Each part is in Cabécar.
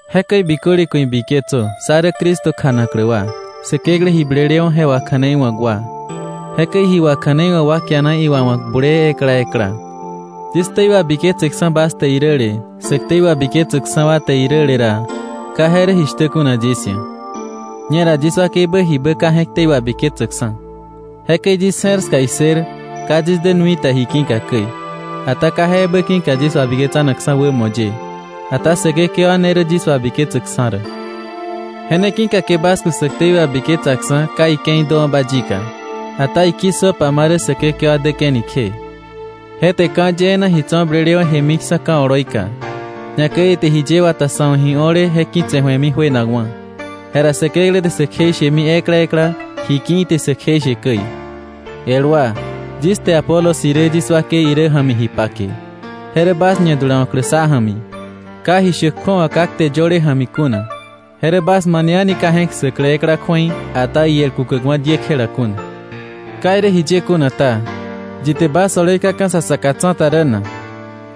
Jekäi biköle ku̱ ibiketsö sá rä Cristo kjanaklä wa, Säkeklä ji blelewa̱ je wakja̱neiwa̱k wa. Jekäi ji wakja̱neiwa̱k wa kiana iwawa̱k bulee ekla ekla. Yis ktei wabiketseksa̱ bas te iräle, sä ktei wabiketsäkksa̱ wa te iräle ra, ka je rä jishtä kuna yis ia̱. Ñera yis wakeibä jibä ka je̱k ktei wabiketsäkksa̱. Jekäi yis je̱r ska issër ka yis dä nui ta ji ki̱ka käi, ata ka je ebä ki̱ka yis wabiketsanakksa̱ wämo ye. Ata Säkekewa ne rä yis wabiketsäkksa̱ rä. Je ne ki̱ka ke bas ku̱ sä ktei wabiketsaksa̱ ka ike̱i däwa̱ba yika, ata iki̱ssöpa ma rä Säkekewa däke̱ni kje. Je te ka̱ yee na ji tso̱ blelewa̱ jemiksa̱ ka̱ oloika, ñakäi ite jiye wata sa̱ wa̱ ji o̱le je ki̱tse̱ ju̱emi juenakwa̱. Jera Säkeklä te sä kjeishemi ekla ekla ji ki̱ ite sä kjeishe käi. El wa, yis te Apolos irä yis wakei irä ja̱mi ji pake, je rä bas ñadulawa̱klä sá ja̱mi, ka ji shäk kju̱awa ka kte yöle ja̱mi kuna. Je rä bas mane a̱ni ka je̱k ssäklä ekla kju̱ei, ata iel kukäkwa̱ diekjela kuna. Ka irä jiye kuna ta, ¿yi te bas oloi kaka̱ sa saka tsa̱ta rä na?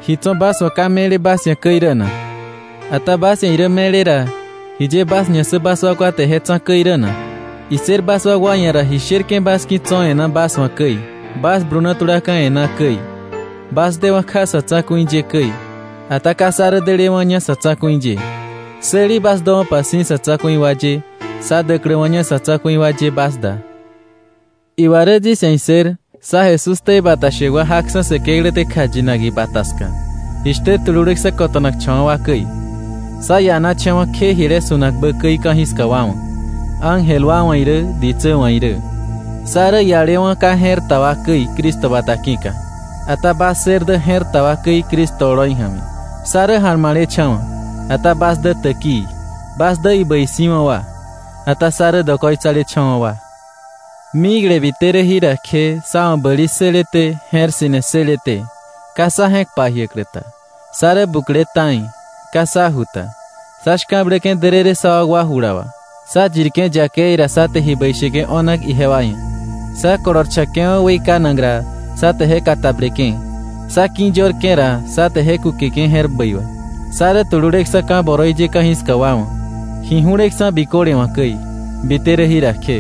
¿Ji tso̱ bas wa̱ ka me̱le bas ia̱ käi rä na? Ata bas ia̱ irä me̱le ra, ¿jiye bas ñassä bas wakwa te je tsa̱ käi rä na? Issër bas wakwa ia̱ ra ji sherke̱ bas ki̱ tso̱ e̱ná bas wa̱ käi, bas bluna tulaka̱ e̱ná käi, bas dewa̱ kja sa̱ tsa̱ku̱i ye käi, ata ka sá rä delewa̱ña sa̱ tsa̱ku̱i ye. Säli bas döwa̱pa si̱ sa̱ tsa̱ku̱i wa ye sá däkläwa̱ña sa̱ tsa̱ku̱i wa ye bas da. Iwa rä yis ia̱ issër sá Jesús ktei bata shäk wa jaksa̱ Säkeklä te kjayinak ibata ska, jishtä tululeksa̱ kota̱nakcha̱wa̱ wa käi. Sá ianacha̱wa̱ kje jile su̱nakbä käi ka̱jiska wa wa̱, ángel wa wa̱ irä ditsä wa̱ irä. Sá rä ialewa̱ ka je̱r ta wa käi Cristo bata ki̱ka, ata bas ssër dä je̱r ta wa käi Cristo oloi ja̱mi. Sá rä ja̱lma̱lecha̱wa̱, ata bas dä täkii. Bas dä ibäi si̱wa̱ wa, ata sá rä dokoitsalecha̱wa̱ wa. Mikle bite rä jira kje sá wa̱ bäli ssëleté je̱r ssi̱ne ssëleté, ka sa je̱k pajiäklä ta, sá rä bukle ta̱i, ka sá ju ta, sá shka̱bläke̱ därërë sá wakwa jula wà. Sá yirke̱ yakei ra, sá te ji bäi sheke̱ o̱nak ijewa ia̱. Sá kolorcha̱ke̱wa̱ weikanak ra, sá te je katableke̱. Sá ki̱yörke̱ ra, sá te je kúkeke̱ je̱r bäi wà. Sá rä tululeksa̱ ka̱ boroi ye ka̱jiska wa wa̱, ji ju̱leksa̱ biköle wa̱ käi, bite rä jira kje.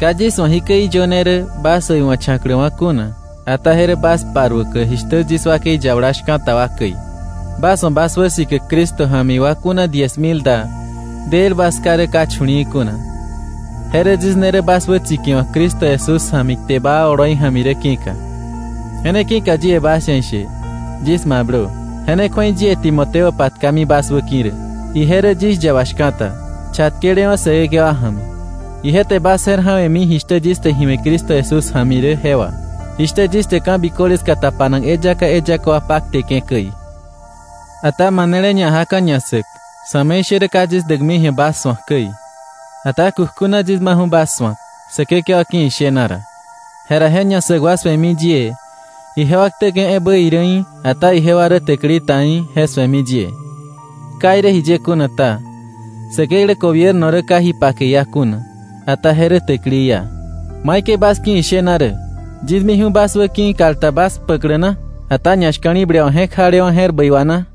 Ka yis wa̱ jikäi iyöne rä bas äiwa̱cha̱kläwa̱ kuna, ata je rä bas paruäklä jishtä yis wakei yabala shka̱ta wa käi. Bas wa̱ bas wäsikäk Cristo ja̱mi wa kuna diez mil da, del bas ká rä ka chu̱li̱i̱ kuna. Je rä yis ne rä bas wätsikiwa̱k Cristo Jesús ja̱mi kte baa oloi ja̱mi rä ki̱ka. Je ne ki̱ka yie bas ia̱ ishe, yis mablö. Je ne kju̱ei yie Timoteo patkami bas wäki̱ rä. Ije rä yis yaba shka̱ta, chatkelewa̱ Säkekewa ja̱mi. Ije te bas je̱r ja̱we̱mi jishtä yis te ji we̱ Cristo Jesús ja̱mi rä je wà, jishtä yis te ka̱biköle ska tapanak eyaka eyaka wa pakteke̱ käi. Ata manele ñajaka̱ ñassäk, sa̱me̱ishärä ka yis däkmi ji̱a bas su̱ak käi. Ata kukjuna yis maju̱ bas su̱ak Säkekewa ki̱ ishena ra. Jera je ñassäk wa su̱emi yie, ijewa ktäke̱ ebä irä í̱, ata ijewa rä täkili ta í̱, je su̱emi yie. Ka irä jiye kuna ta, Säkeklä gobierno rä ka ji pake iá kuna. Ata je rä täkili iá. ¿Maikäi bas ki̱ ishena rä? ¿Yis miju̱ bas wä ki̱ kal ta bas kpäklä na, ata ñashka̱li̱ble wà je̱k jalewa̱ je̱r bäi wà na?